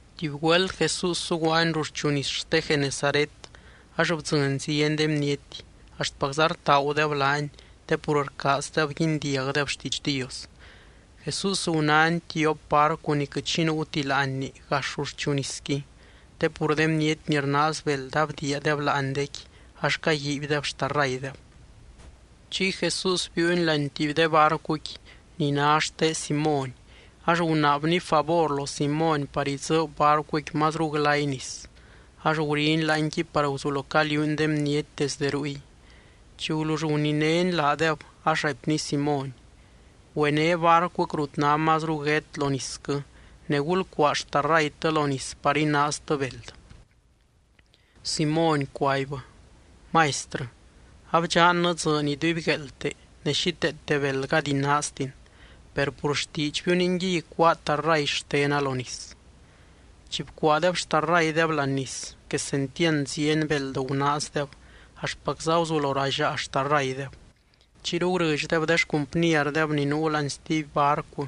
Tuby güelt Jesús zuguaany ruxchu nis xte Genesaret ax bdzɨny zieny de bniety, axtpacza rtaagudeb laany te pur rcaazdeb guindiagdeb xtiidx Dios. Jesús gunány tiop barcu ni quɨt xi nuuti láanni gax ruxchu nisqui, te pur de bniety ni rnaaz beld abdiiadeb laanidéqui ax caguiibydeb xtarraydeb. Chiy Jesús biiuny laany tuby de barcuqui ni ná xte Simóny ax gunaabny favor lo Simóny par idzɨɨb barcuqui mazru glay nis. Ax guriny láanqui par guzulo caliuuny de bniety desde ruy. Chi gulull guninény laadeb, ax raipny Simóny: —Güené barcuquɨ rut ná mazru guét lo nisquɨ ne gulcuaa xtarraytɨ lo nis par inaaztɨ beld. Simóny cuaibbɨ: —Maistrɨ, abdxannɨ dzɨɨny idubygueelte ne xíteete beld gady inaaztin. Per pur xtiidxbiu ningui icuáa tarray xtena lo nis. Chi bcuaadeb xtarraydeb láani nis, quesentiand zieny beld gunaazdeb axtpacza guzulo ralliaa xtarraydeb. Chiyru gurɨdxdeb de xcumpnierdeb ni nuu láani stuby barcu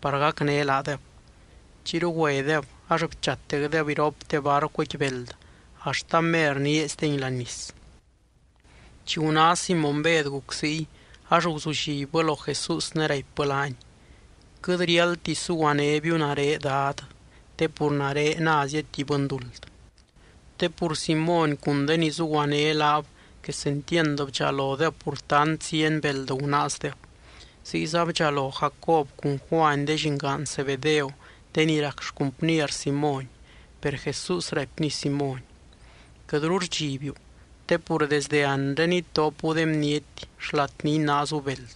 par gacné laadeb. Chiyru güedeb ax bchatecdeb iropte barcuqui beld axt amer nieeizdengui láani nis. Chi guná Simóny Bed guc ziy, ax guzullibbɨ lo Jesús ne raipbɨ laany: —Quɨt riáldti suguanébiu nare, Dad, te pur nare názia tuby bɨnduld. Te pur Simóny cun de ni zuguané laab quesentiand bdxalodeb pur tant zieny beld gunaazdeb. Ziyza bdxalo Jacob cun Juany de llingaan Zebedeo de ni rac xcumpnier Simóny. Per Jesús raipny Simóny: —Quɨtru rdxibiu te pur desdɨ anre itopu de bniety xlat ni inaazu beld.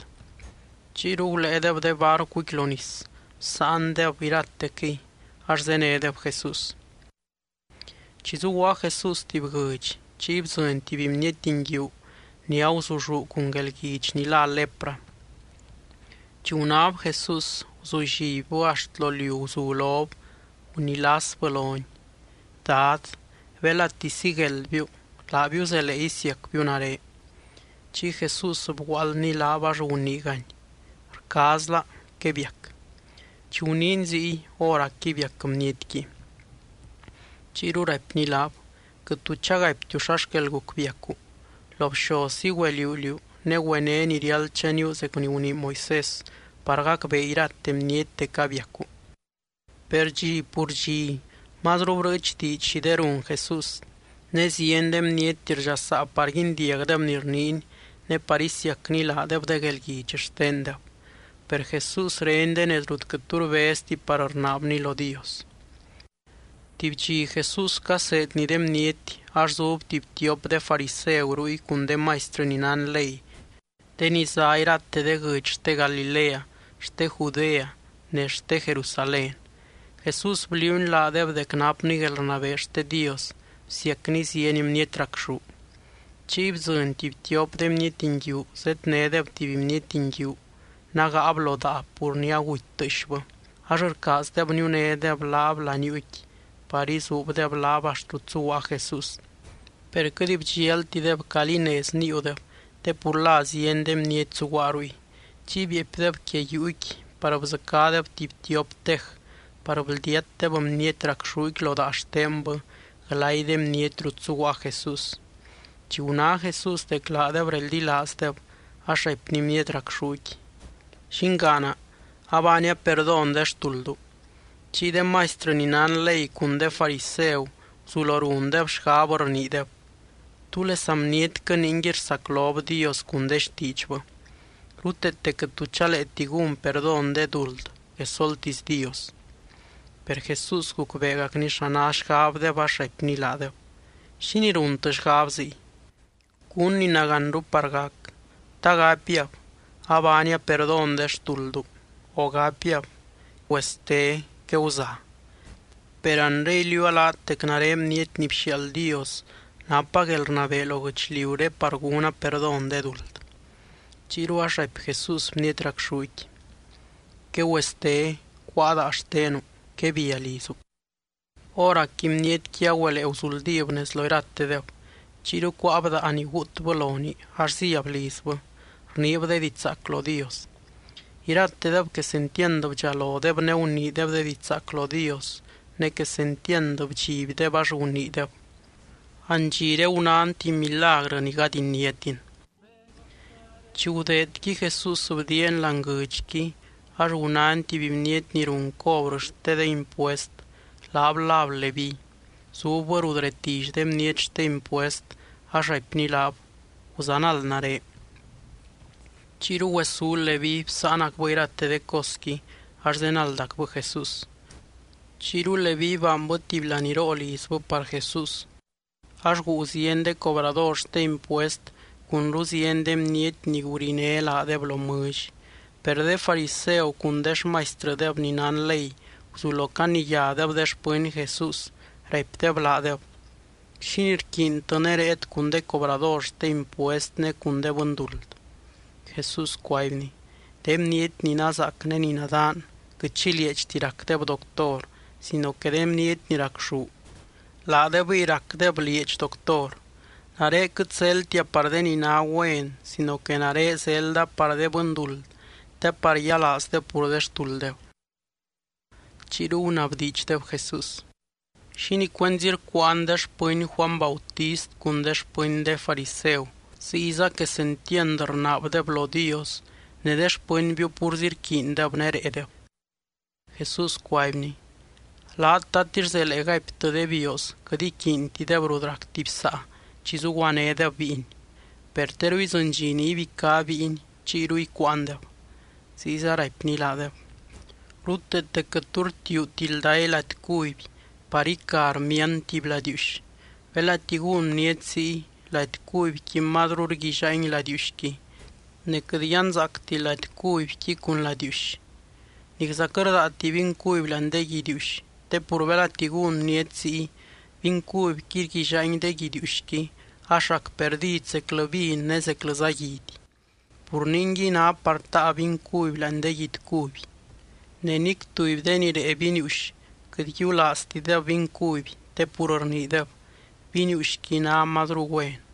Chiyru guléedeb de barcuqui lo nis, bsáandeb iratequɨy ax zénedeb Jesús. Chi zuguaa Jesús tuby guɨdx, chiy bdzɨny tuby bniety nguiu ni aguzulluu cun guelguidx ni lá lepra. Chi gunáb Jesús, guzullibbɨ axt lo liu guzu lob gunilasbɨ lony: —Dad, belati sigueldbiu, laabiu zelee isiacbiu nare. Chiy Jesús bguaaldny laab ax guniigany: —Rcaazla. Quebiac. Chi guniiny ziy, hóracqui biac bnietqui. Chiyru raipny laab: —Quɨt tu chagaiptiu xa xquel guc biacu. Lo bxozzi güeliuu liú ne güené ni riáld chaníu zec ni gunii Moisés, par gacbee irate bniety dec abiacu. Per dxi pur dxi mazru brɨɨch diidx xi de run Jesús, ne zieny de bniety rdxasaa par guindiagdeb ni rniiny ne par isiacny laadeb de guelguidx xtendeb. Per Jesús reny de nez rut quɨt tu rbezti par rnaabny lo Dios. Tuby dxi Jesús caseedny de bniety ax zub tuby tiop de fariseu ruy cun de maistrɨ ni nán ley de ni zá irate de guɨdx xte Galilea, xte Judea ne xte Jerusalén. Jesús bliuuny laadeb dec napny guelrnabee xte Dios bsiacny zieny bniety racxú. Chiy bdzɨny tuby tiop de bniety nguiu zednédeb tuby bniety nguiu nágaab lo daa pur ni aguty tɨɨxbɨ, ax rcaazdeb niunédeb laab laniuuqui par izuubdeb laab axt rut zuguaa Jesús. Per quɨt bdxialtideb calí nez níiudeb te pur la zieny de bniety zuguaa ruy. Chiy bieepydeb quia yuuqui par bdzɨcádeb tuby tiop tej par bldiatdeb bniety racxúqui lo daa xtenbɨ glay de bniety rut zuguaa Jesús. Chi guná Jesús dec laadeb reldilaazdeb ax raipny bniety racxúqui: —Llingaana, abaania perdón de xtuldu. Chiy de maistrɨ ni nán ley cun de fariseu guzulo rundeb xgab rniideb: “¿Túlesa bnietquɨ ningui rsaclob Dios cun de xtiidxbɨ? Ruteete quɨt tu chaleeti gún perdón de duld quesoltisy Dios.” Per Jesús gucbeegacny xa ná xgabdeb ax raipny laadeb: —¿Xínii runtɨ xgab ziy? ¿Cún ni nagánru par gac, ta gapiab: “Abaania perdón de xtuldu”, o gapiab: “Güeste, queguza”? Per anre iliuua laat dec nare Bniety ni bxiaald Dios napa guelrnabee lo guɨchliuré par gúna perdón de duld. Chiyru ax raipy Jesús bniety racxúqui: —Quegüeste. Cuáa daa xtenu. Quebia lizu. Hóracqui bnietqui agüelee guzuldíb nez lo iratedeb. Chiyru cuáab daa ni guutbɨ lonii ax zíab lizbɨ, rniib de diidx zaac lo Dios. Iratedeb quesentiand bdxalodeb ne guniideb de diidx zaac lo Dios, ne quesentiand bdxibdeb ax guniideb: —Andxiré gunán tuby milagrɨ ni gady iniátin. Chi gudeedqui, Jesús bdiiany láani guɨdxqui ax gunány tuby bniety ni run cobrɨ xte de impuest, laab láb Leví. Zubbɨ rut retilly de bniety xte impuest ax raipny laab: —Guzanald nare. Chiyru güesú Leví bsáanacbɨ irate de cosqui ax zenaldacbɨ Jesús. Chiyru Leví baanbɨ tuby laníroo lizbɨ par Jesús ax guu zieny de cobrador xte impuest cunru zieny de bniety ni guriné laadeb lo mɨlly. Per de fariseu cun de xmaistrɨdeb ni nán ley guzulo caniyádeb de xpɨny Jesús, raipdeb laadeb: —¿Xínii rquiintɨ ne réet cun de cobrador xte impuest ne cun de bɨnduld? Jesús cuaibny: —De bniety ni nazaac ne ni nadaan quɨt xi lieedxti racdeb doctor sino que de bniety ni racxú, laadebɨy racdeb lieedxi doctor. Nare quɨt zeldtia par de ni ná güen sino que nare zelda par de bɨnduld te par yialaazdeb pur de xtulddeb. Chiyru gunabdiidxdeb Jesús: —¿Xínii cuenzi rcuuan de xpɨny Juany Bautist cun de xpɨny de fariseu, ziyza quesentiand rnaabdeb lo Dios ne de xpɨnbiu púrzi rquiindeb ne réedeb? Jesús cuaibny: —Laat, ¿tatix zelee gaiptɨ de bioos quɨt iquiintideb rut rac tuby saa chi zuguanédeb bíiny? Per teru idzɨny dxi ni ibicá bíiny. Chiyru icuuandeb. Ziyza raipny laadeb: —Ruteete quɨt tu rtiuuti lday lady cuby par ica rmiand tuby ladiiuxy. Belati gún bniety ziy, lady cubyqui mazru rguillaangui ladiiuxqui. Ne quɨt yanzaacti lady cubyqui cun ladiiuxy. Nicza quɨt rdaati vin cuby láani de guidiiuxy, te pur belati gún bniety ziy, vin cubyqui rguillaangui de guidiiuxqui ax rac perdid zeclɨ vin ne zeclɨza guidy. Pur ningui ná par taa vin cuby láani de guidy cuby. Ne nic tuby de ni rée viniiuxy quɨt yiulaaztideb vin cuby te pur rniideb: “Viniiuxqui ná mazru güen.”